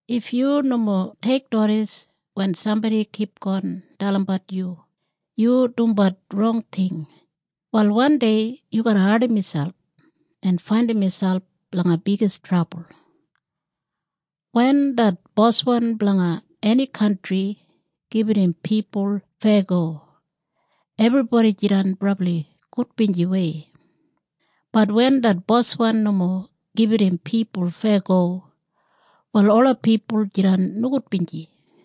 If yu nomo teiknodis wen sambodi kipgon dalimbat yu, yu dumbat rong ting, wal wandei yu garra ardim miselp en faindim miselp langa bigis trabul. Wen det boswan blanga eni kantri gibit im pipul feyago ebribodi jidan brabli gudbinjiwei, bat wen det boswan nomo gibit im pipul feyago wal ola pipul jidan nogudbinji.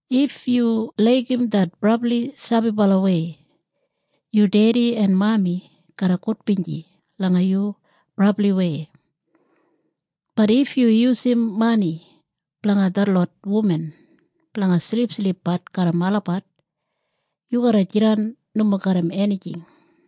If yu laigim det brabli sabibalawei, yu dedi en mami garra gudbinji langa yu brabliwei, bat if yu yusum mani blanga detlot wuman blanga silipsilipbat garram olabat, yu garra jidan nomo garram enijing.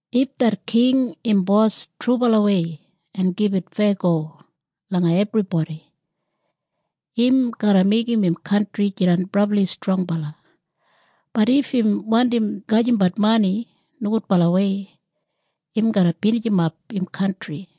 If det king im bos trubalawei en gibit feyago langa ebribodi im garra meigim im kantri jidan brabli strongbala, bat if im wandim gajimbat mani nogudbalawei im garra binijimap im kantri.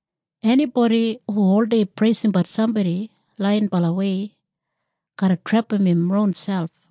Enibodi hu oldei preisimbat sambodi laiyinbalawei garra trepam im ronselp.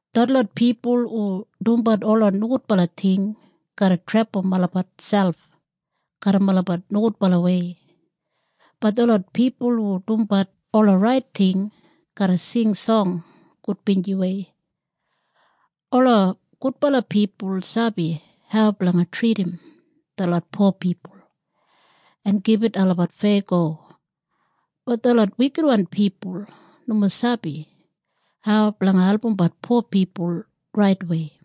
Detlot pipul hu dumbat ola nogudbala ting garra trepam olabat selp garram olabat nogudbalawei, bat detlot pipul hu dumbat ola rait ting garra sing song gudbinjiwei. Ola gudbala pipul sabi hau blanga tridim detlot po pipul en gibit olabat feyago, bat detlot wikitwan pipul nomo sabi hau blanga albumbat po pipul raitwei.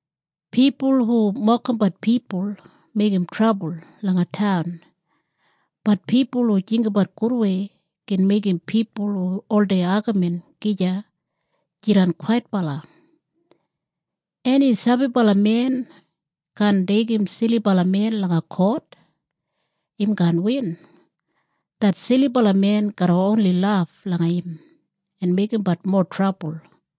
Pipul hu mokimbat pipul meigim trabul langa taun, bat pipul hu jinggabat gudwei gin meigim pipul hu oldei agamin gija jidan kwaitbala. Eni sabibala men kaan deigim silibala men langa kot. Im kaan win. Det silibala men garra oni laf langa im en meigimbat mowa trabul.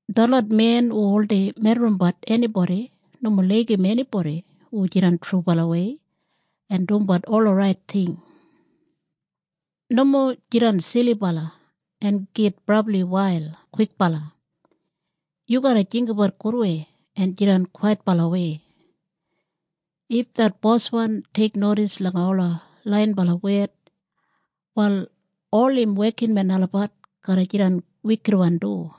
Detlot men hu oldei medrimbat enibodi nomo laigim enibodi hu jidan trubalawei en dumbat ola rait ting. Nomo jidan silibala en git brabli wail kwikbala. Yu garra jinggabat gudwei en jidan kwaitbalawei. If det boswan teiknodis langa ola laiyinbala wed, wal ol im wekinmen olabat garra jidan wikitwan du.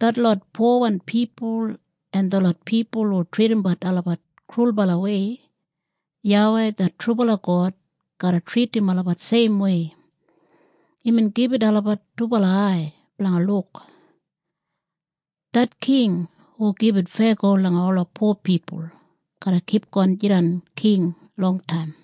Detlot powan pipul en detlot pipul hu tridimbat olabat krulbalawei, YAWEI det trubala God garra tridim olabat seimwei. Imbin gibit olabat dubala ai blanga luk. Det king hu gibit feyago langa ola po pipul garra kipgon jidan king longtaim.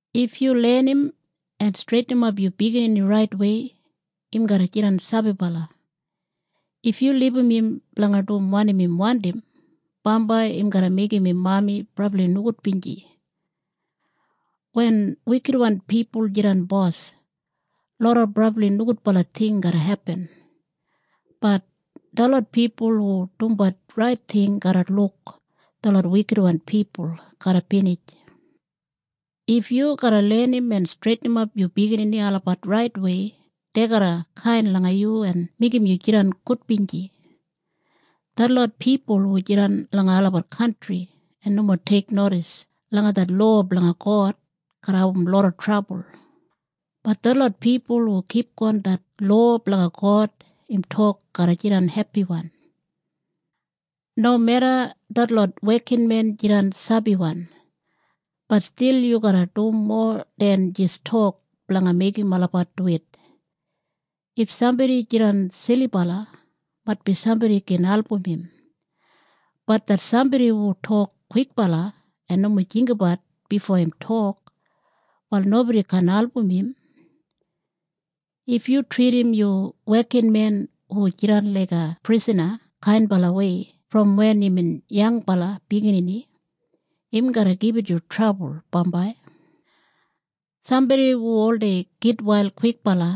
If yu lenim en streitinimap yu biginini raitwei, im garra jidan sabibala. If yu libum im blanga dum wanim im wandim, bambai im garra meigim im mami brabli nogudbinji. Wen wikitwan pipul jidan bos, loda brabli nogudbala ting garra hepin, bat detlot pipul hu dumbat rait ting garra luk detlot wikitwan pipul garra binij. If yu garra lenim en streitinimap yu biginini olabat raitwei dei garra kain langa yu en meigim yu jidan gudbinji. Detlot pipul hu jidan langa olabat kantri en nomo teiknodis langa det lowa blanga God garra abum loda trabul, bat detlot pipul hu kipgon det lowa blanga God im tok garra jidan hepiwan. Nomeda detlot wekinmen jidan sabiwan, bat stil yu garra dum mowa den jis tok blanga meigim olabat duwit. If sambodi jidan silibala maitbi sambodi gin album im, bat det sambodi hu tok kwikbala en nomo jinggabat bifo im tok, wal nobodi kaan album im. If yu tridim yu wekinmen hu jidan laiga prisana kainbalawei brom wen imbin yangbala biginini, im garra gibit yu trabul bambai. Sambodi hu oldei gitwail kwikbala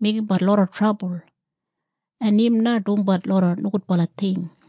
meigimbat loda trabul, en im na dumbat loda nogudbala ting.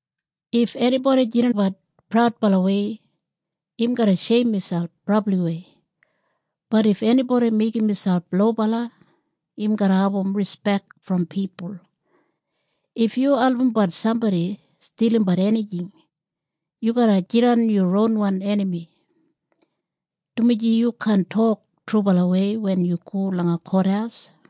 If enibodi jidanbat praudbalawei im garra sheim miselp brabliwei, bat if enibodi meigim miselp lobala im garra abum rispek brom pipul. If yu albumbat sambodi stilimbat enijing, yu garra jidan yu ronwan enami, dumaji yu kaan tok trubalawei wen yu go langa kothaus.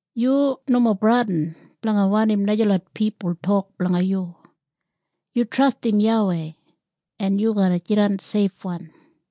Yu nomo bradin blanga wanim najalot pipul tok blanga yu. Yu trastim YAWEI en yu garra jidan seifwan.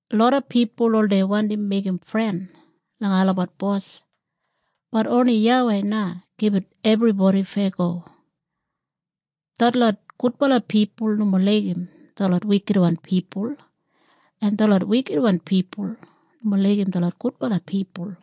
Loda pipul oldei wandim meigim fren langa olabat bos, bat oni YAWEI na gibit ebribodi feyago. Detlot gudbala pipul nomo laigim detlot wikitwan pipul en detlot wikitwan pipul nomo laigim detlot gudbala pipul.